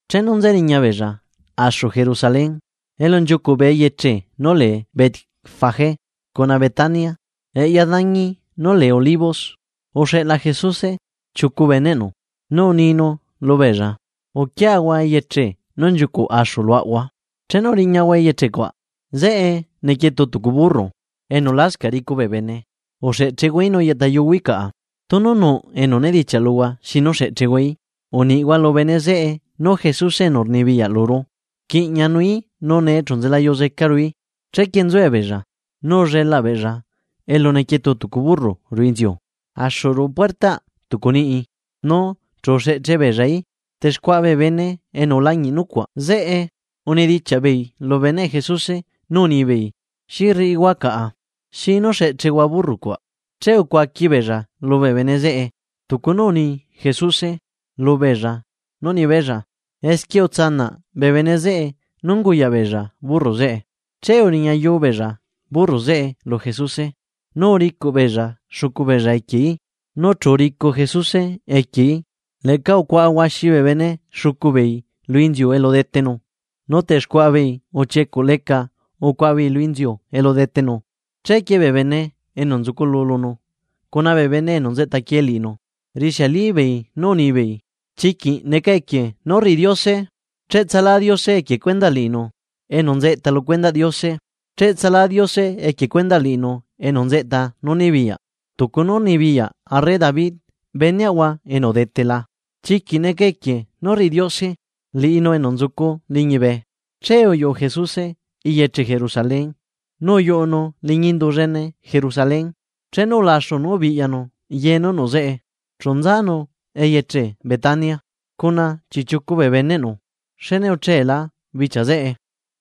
Chenu nzeriña beella axu Jerusalén, elu nchiucuꞌ bee eyeche nú lee Betfagé cuna Betania, eꞌya dañi nú lee Olivos, uxeꞌla Jesuse chiucu beneꞌnu, nu uninu lubeella: ―Uquiahua eyeche axu nú nchiucuꞌ enza luaꞌahua, chenu riñahua eyeche cuaꞌ, zeꞌe nequietu tucu burro, enu lascaꞌ ricu bee bene. Uxeꞌchehuaií nu yeꞌta yuhuaí caꞌa. Tunu nuꞌ enu nedichiaꞌ luhua xi nu xeꞌchehuaí, uniꞌhua lu bene zeꞌe nú Jesuse enu rnibiyaꞌ luru rquiꞌñanuí nu nee chu nzela yuzecaruí. Chequie nzuebeella, nu ullelaꞌ beella elu nequietu tucu burro ruꞌu inziu, axu ruꞌu puertaꞌ tucu niꞌi, nu chu uxeꞌche beellaí. Texcuaꞌa bee bene enu ulañiꞌ nucuaꞌ zeꞌe unidichiaꞌbeei lubee beneꞌ Jesuse nu unibeei: ―¿Xi rriꞌihua caꞌa? ¿Xi nú xeꞌchehua burro cuaꞌ? Che ucuaqui beella lubee bene zeꞌe tucu nú uni Jesuse lubeella nú nibeella, esquie uzela bee bene zeꞌe nú unguyaꞌ beella burro zeꞌe. Che uriñayu beella burro zeꞌe lu Jesuse. Nu uricuꞌ beella xucu beellaequieí, nu chu uricu Jesuse equieí Leꞌca ucuaꞌa huaxi bee bene xucu beei lu inziu elu detenu, nu texcuaꞌa beei uchiecuꞌ leca ucuaꞌa beei lu inziu elu detenu. Chequie bee bene enu nzuculu lunu cuna bee bene enu nzeꞌtaquie liꞌinu, rixiali beei nú unibeei: ―¡Chiquiꞌ neca equie nú rriꞌi Diose! ¡Cheꞌtsalá Diose equie cuendaꞌ liꞌinu enu nzeꞌta lu cuendaꞌ Diose! ¡Cheꞌtsalá Diose equie cuendaꞌ liꞌinu enu nzeꞌta nú nibiyaꞌ, tucu nú unibiyaꞌ arre David beneꞌahua enu udetela! ¡Chiquiꞌ neca equie nú rriꞌi Diose liꞌinu enu nzucu liñibe! Che uyuꞌu Jesuse eyeche Jerusalén nu uyuꞌunu liñi indu llene Jerusalén. Chenu ulaxu nú ubiꞌyanu ye nú nuꞌ zeꞌe chu nzanu eyeche Betania cuna chiꞌchiucu bee beneꞌnu, xne ucheela bichia zeꞌe.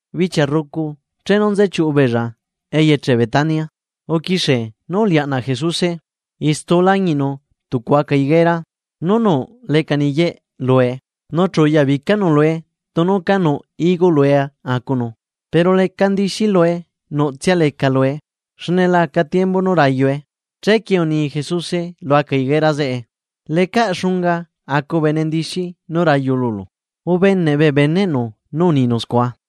Bichia rrucu, chenu nze chiuꞌu beella eyeche Betania, uquixie nú ulianaꞌ Jesuse. Istu ulañiꞌnu tucu aca higuera nu nuꞌ leca niyeꞌe lue, nu chu uyabicanu lue tunu ca nuꞌ higo lue acunu, pero leca ndixi lue nuꞌtsia leca lue, xne la aca tiembu nú rayue. Chequie uni Jesuse lu aca higuera zeꞌe: ―¡Lecaꞌ xunga acu bene ndixi nú rayu lulu! Ubeneꞌ bee beneꞌnu nú uninu scua.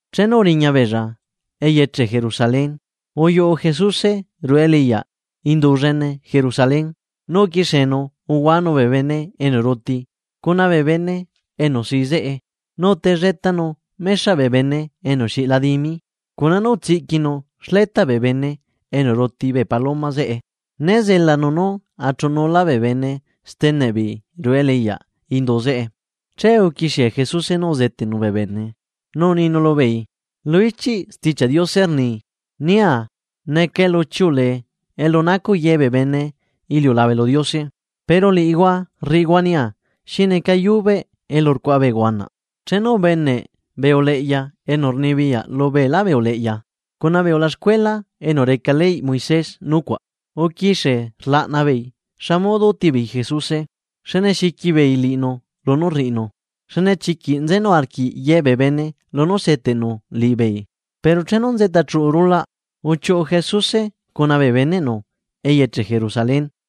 Chenu uriña beella eyeche Jerusalén, uyuꞌu Jesuse ruꞌu eleꞌyaꞌ Indu llene Jerusalén nu uquixienu uluanu bee bene enu ruti cuna bee bene enu sii zeꞌe. Nu utelletanu mexaꞌ bee bene enu xiꞌla dimi cuna nú utsiꞌquinu xletaꞌ bee bene enu ruti bee paloma zeꞌe, né zelanu nú achuꞌu nulá bee bene steneꞌ beei ruꞌu eleꞌyaꞌ indu zeꞌe. Che uquixie Jesuse nú uzeteꞌnu bee bene, nu uninu lubeei: ―Lu ichiꞌ Stichiaꞌ Diose rni: “Nia neca elu chiuꞌulee elu nacuꞌ ye bee bene iliulabe lu Diose”; pero liꞌihua rriꞌihua nia xineca yubeꞌ elu rcuaꞌa bee huanaꞌ. Chenu ubeneꞌ bee uleꞌya enu rnibiyaꞌ lu beelá bee uleꞌya cuna bee ulaxcuela enu reca leyꞌ Moisés nucuaꞌ, uquixie rlaꞌna beei xa modo útibeei Jesuse xne xiqui beei liꞌinu lunú rriꞌinu, xne chiquiꞌ nzenu arquiꞌ ye bee bene lunú seteꞌnu liꞌibeei. Pero chenu nzeꞌta chuꞌu rulaꞌ, uchiuꞌu Jesuse cuna bee beneꞌnu eyeche Jerusalén.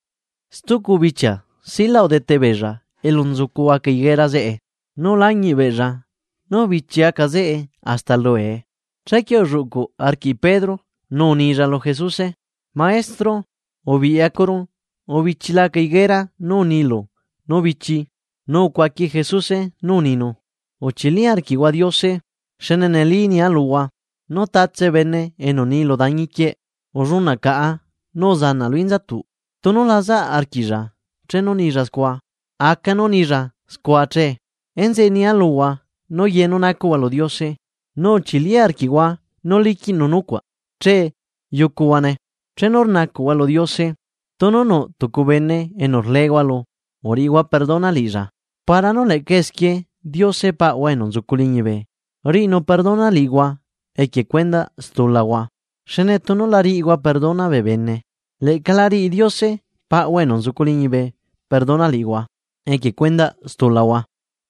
Stucu bichia silaꞌ udete beella elu nzucu aca higuera zeꞌe, nu ulañiꞌ beella nú ubichi aca zeꞌe hasta luue. Chequie ulluꞌcu arquiꞌ Pedro, nu unilla lu Jesuse: ―Maestro, ubiꞌyacuru, ubichila aca higuera nú unilu nú bichi. Nu ucuaqui Jesuse nú uninu: ―Uchili arquiꞌhua Diose. Xne neli nia luhua, nú tatse bene enu ni lu dañi quieꞌ: “¡Ullunaꞌ caꞌa nu uzanaꞌ lu inzatuꞌ!”, tunu la zaꞌ arquiꞌlla chenu nilla scua, aca nú unilla scua che. Enzeꞌe nia luhua nú ye nú nacuꞌhua lu Diose, nu uchili arquiꞌhua nú liquiꞌnu nucuaꞌ che yucuhuane. Chenu rnacuꞌhua lu Diose, tunu nuꞌ tucu bene enu rleehua lu uriꞌihua perdona liꞌilla, para nú leꞌca esquie Diose Paꞌahua enu nzucu liñibe riꞌinu perdona liꞌihua equie cuendaꞌ stulahua. Xne tunu la riꞌihua perdona bee bene, leꞌca la riꞌi Diose Paꞌahua enu nzucu liñibe perdona liꞌihua equie cuendaꞌ stulahua.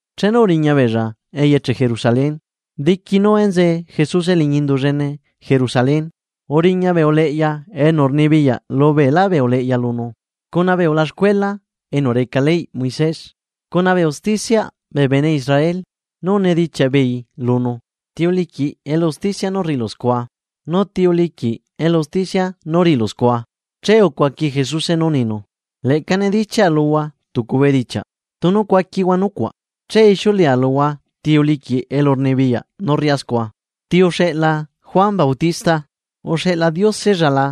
Chenu uriña beella eyeche Jerusalén. Diqui nú enzee Jesuse liñi Indu llene Jerusalén, uriña bee uleꞌya enu rnibiyaꞌ lu beelá bee uleꞌya lunu, cuna bee ulaxcuela enu reca leyꞌ Moisés cuna bee usticiaꞌ bee bene Israel, nu unidichiaꞌ beei lunu: ―¿Ti uliquiꞌ elu usticia nú rriꞌilu scua? ¿Nu ti uliquiꞌ elu rnibiyaꞌ nú rriꞌilu scua? Che ucuaqui Jesuse nú uninu: ―Leꞌca nidichiaꞌa luhua tucu bedichiaꞌ tunu cuaquihua nucuaꞌ, che ixiuleꞌa luhua ti uliquiꞌ elurnibiyaꞌ nú rriꞌá scua. ¿Ti uxeꞌla Juan Bautista? ¿Uxeꞌla Diosella la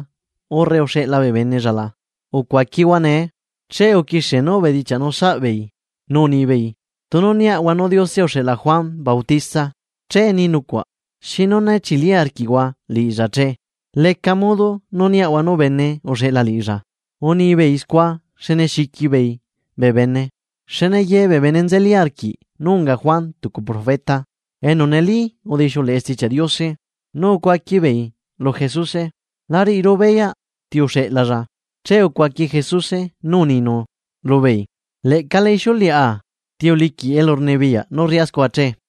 urre uxeꞌla bee benella la? Ucuaquihua nee. Che uquixie beei nú ubedichiaꞌnu saꞌbeei nú unibeei: ―Tunu niaꞌahua nu Diose uxeꞌla Juan Bautista, che ni nucuaꞌ: “¿Xinu né chili arquiꞌhua liꞌilla che?” ¿Leca modo nú niaꞌahua nú bene uxeꞌla liꞌilla? Unibeei scua xne xiqui beei bee bene, xne ye bee bene nzeli arquiꞌ nú unga Juan tucu profeta enu neli udixiuleꞌe Stichiaꞌ Diose. Nu ucuaqui beei lu Jesuse: ―La riꞌiru beyaꞌ ti uxeꞌlalla. Che ucuaqui Jesuse nú uninu lubeei: ―Leꞌca la ixiuleꞌa ti uliquiꞌ elurnibiyaꞌ nú rriꞌá scua che.